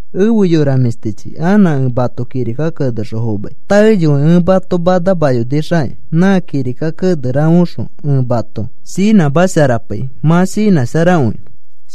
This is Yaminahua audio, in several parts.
Efe yora mĩshtichi, anã ẽ mato kirika kenexõ fomai. Taeyoi ẽ mato manamayonixakĩ, nã kirika kene rafeoxõ ẽ mato shinãmasharapai mã shinãsharakõinõ.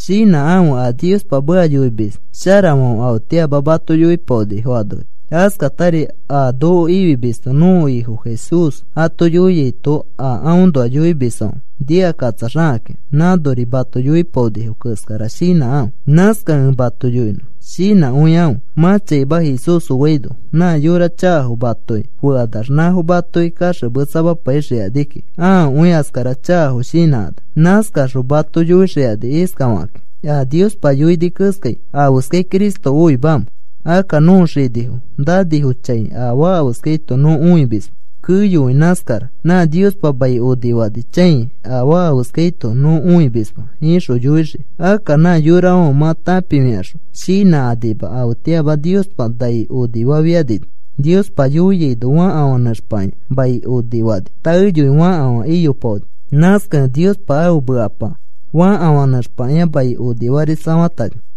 Shinãkãfe, a Niospa meka yoimis sharafãfe afetĩama mato yoipaonifo anori. Askatari a noko ifimisto nõko Ifo Jesús ato yoiaito a aõnoa yoimisfãfe nikakatsaxakakĩ nãnori mato yoipaonifo keskara shinãkãfe. Nãskakẽ ẽ mato yoinõ shinãkõikãfe. Mã chaima Jesús oaino nã yora chakafo matoki fekanax nãfo matoki kaxemetsamapaixikani kiki ãakõi askara chakafo shinãkanax. Nãskaxõ mato yõkaxikani iskafakakĩ: “A Niospa yoini keskai, ¿afeskai Cristo oimamẽ? Akka nõko xinifo nanifo chãikai afaa afeskaito nõ õimisma, keyokõi nãskara. Nã Niospa mai onifani chãi afaa afeskaito nõ õimisma,” ixõ yoixii. Akka nã yorafãfe mã tãpifikaxõ shinãkanima, afetĩama Niospa nai onifafianino Niospa yoiaino fakafã nẽxpakĩa mai onifani, taeyoi fakafã iyopaoni. Nãskakẽ Niospa ãfe mekapa fakafã nẽxpakĩa mai onifarisafatani.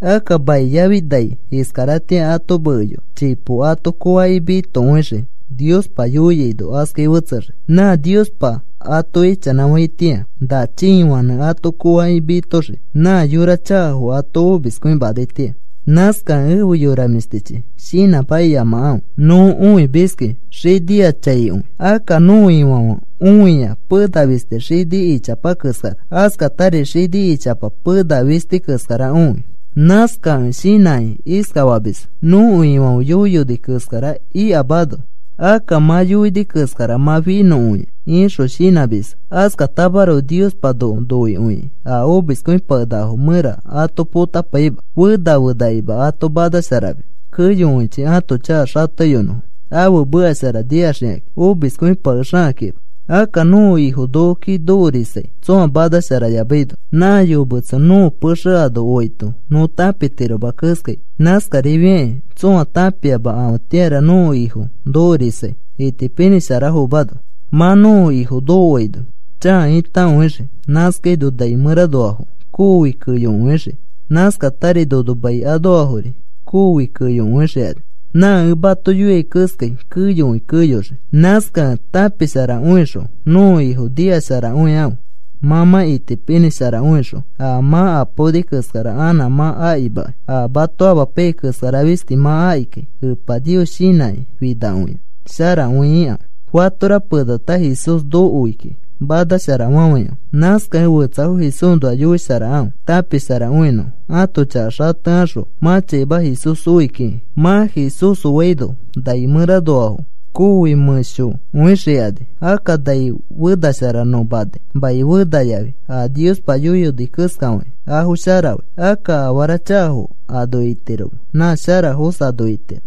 Akka mai yafi nai iskaratĩa ato mekeyoa, chipo ato koofakĩ mitokõixii. Niospa yoiaino askai fetsexii. Nã Niospa ato ichanãfaitĩa na chiifãnẽ ato koofakĩ mitoxii nã yora chakafo ato omiskõimanaitĩa. Nãskakẽ efe yora mĩshtichi, shinãmakiyamakãfe. Nõ õimiski xiniachãikõi. Akka nõko Ifãfe õia pena fisti xini ichapa keskara, askatari xini ichapa pena fisti keskara õi. Nãskakẽ shinãkĩ iskafamisfo: “Nõko Ifãfe yoiyoni keskara ikamano, akka mã yoini keskara mã finõkõia,” ixõ shinãmisfo. Askatamaroko Niospa noko noikõikĩ a omiskõipakenakafo mẽra ato potapaima. Fena fenakima ato manasharamis keyokõichi ãto chaka xateyonõfo ãfe meka shara nikaxikakĩ omiskõipakexakakĩma. Akka nõko Ifo nokoki nokorisai tsõa manasharayamaino nã yometso nõko pexe ano oaito nõ tãpitiroma keskai. Nãskarifiakĩ tsõa tãpiama afetĩara nõko Ifo nokorisai, itipinĩsharafomano. Mã nõko Ifo nokoaino chãa itakõixii. Nãskaino nai mẽranoafo koofi keyokõixii, nãskatari nono mai anoafori koofi keyokõixikani. Nã ẽ mato yoiai keskai keyokõi keyoxii. Nãskakẽ tãpisharakõixõ nõko Ifo nikasharakõikãfe. Mã mã itipinĩsharakõixõ a mã apaoni keskara anã mã akimakai. A mato amapaiyai keskara fisti mã akikai. Epa Nios shinãkĩ finakõiax sharakõi ikãfe. Fatora penata Jesús nokoi kiki manashara fafãikãfe. Nãskakẽ fetsafo Jesúsnoa yoisharakãfe tãpisharakõinõfo, ãto chaka xatekaxõ mã chaima Jesús oi kiki. Mã Jesús oaino nai mẽranoafo koofi mẽsho mẽshokõixikani. Akka nai fenashara nõ manai, mai fena yafi a Niospa yoiyoni keskafakĩ afo sharafai. Akka afara chakafo ano itiroma, nã sharafos ano itirofo.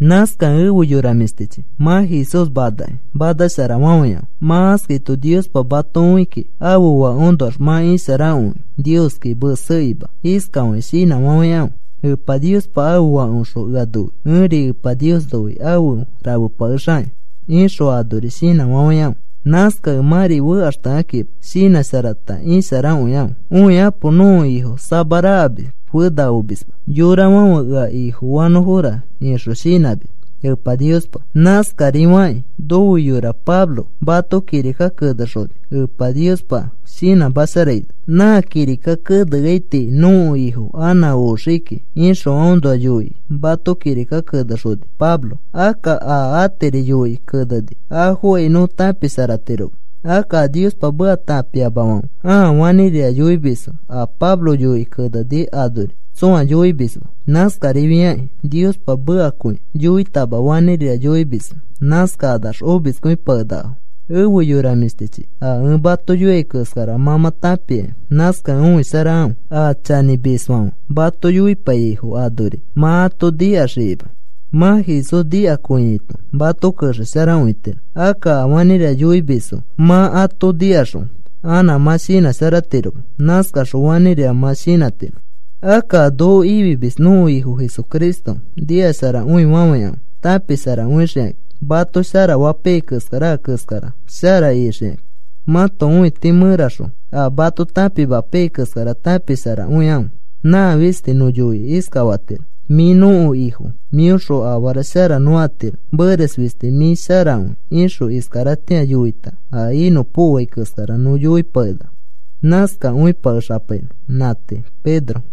Nãskakẽ efe yora mĩshtichi, mã Jesús manakĩ manasharafafãikãfe. Mã askaito Niospa mato õi kiki ãfe Fãkeõnoax mã isharakõikẽ. Nioski mesekĩma iskafakĩ shinãfafãikãfe: “Epa Niospa ãfe Fakeõxõ ea noi. Ẽri Epa Nios noi afe rafepakexakĩ,” ixõ anori shinãfafãikãfe. Nãskakẽ mãri fekaxtekãkima. Shinãsharata isharakõikãfe. Õikapo. Nõko Ifo samarakamis fena omisma yorafãfe ea Ifofanõfora ixõ shinãmis Epa Niospa. Nãskarifakĩ nofe yora Pablo mato kirika kenexoni Epa Niospa shinãmasharaino. Nã kirika keneai tii nõko Ifo anã oxii kiki ixõ aõnoa yoikĩ mato kirika kenexoni Pablo. Akka a atiri yoikĩ keneni afokai nõ tãpisharatiroma. Akka a Niospa meka tãpiamafãfe ãa fanĩrira yoimisfo a Pablo yoikĩ keneni anori tsõa yoimisma. Nãskarifiakĩ Niospa mekakõi yoitama, fanĩrira yoimisfo. Nãskakanax omiskõipakenakafo. Efe yora mĩshtichi, a ẽ mato yoiai keskara mã mã tãpiaki. Nãskakẽ õisharakãfe, a chanĩmisfãfe mato yoipaiyaifo anori mã ato nikaxikima. Mã Jesús nikakõiaito mato kexesharakõitiro. Akka a fanĩrira yoimisfo mã ato nikaxõ anã mã shinãsharatiroma. Nãskaxõ fanĩrira mã shinãtiro. Akka a noko ifimis nõko Ifo Jesucristo nikasharakõifafãikãfe tãpisharakõixikakĩ. Mato sharafapaiyai keskara a keskara shara ixikakĩ. Mãto õiti mẽraxõ a mato tãpimapaiyai keskara tãpisharakõikãfe. Nã fisti nõ yoikĩ iskafatiro: “Mĩ nõko Ifo, mĩõxõ afara shara nõ atiro, meres fisti mĩ sharakõi,” ixõ iskaratĩa yoita a inõpokoai keskara nõ yoipakenaka. Nãskakõipakexanõ. Nã tii. Pedro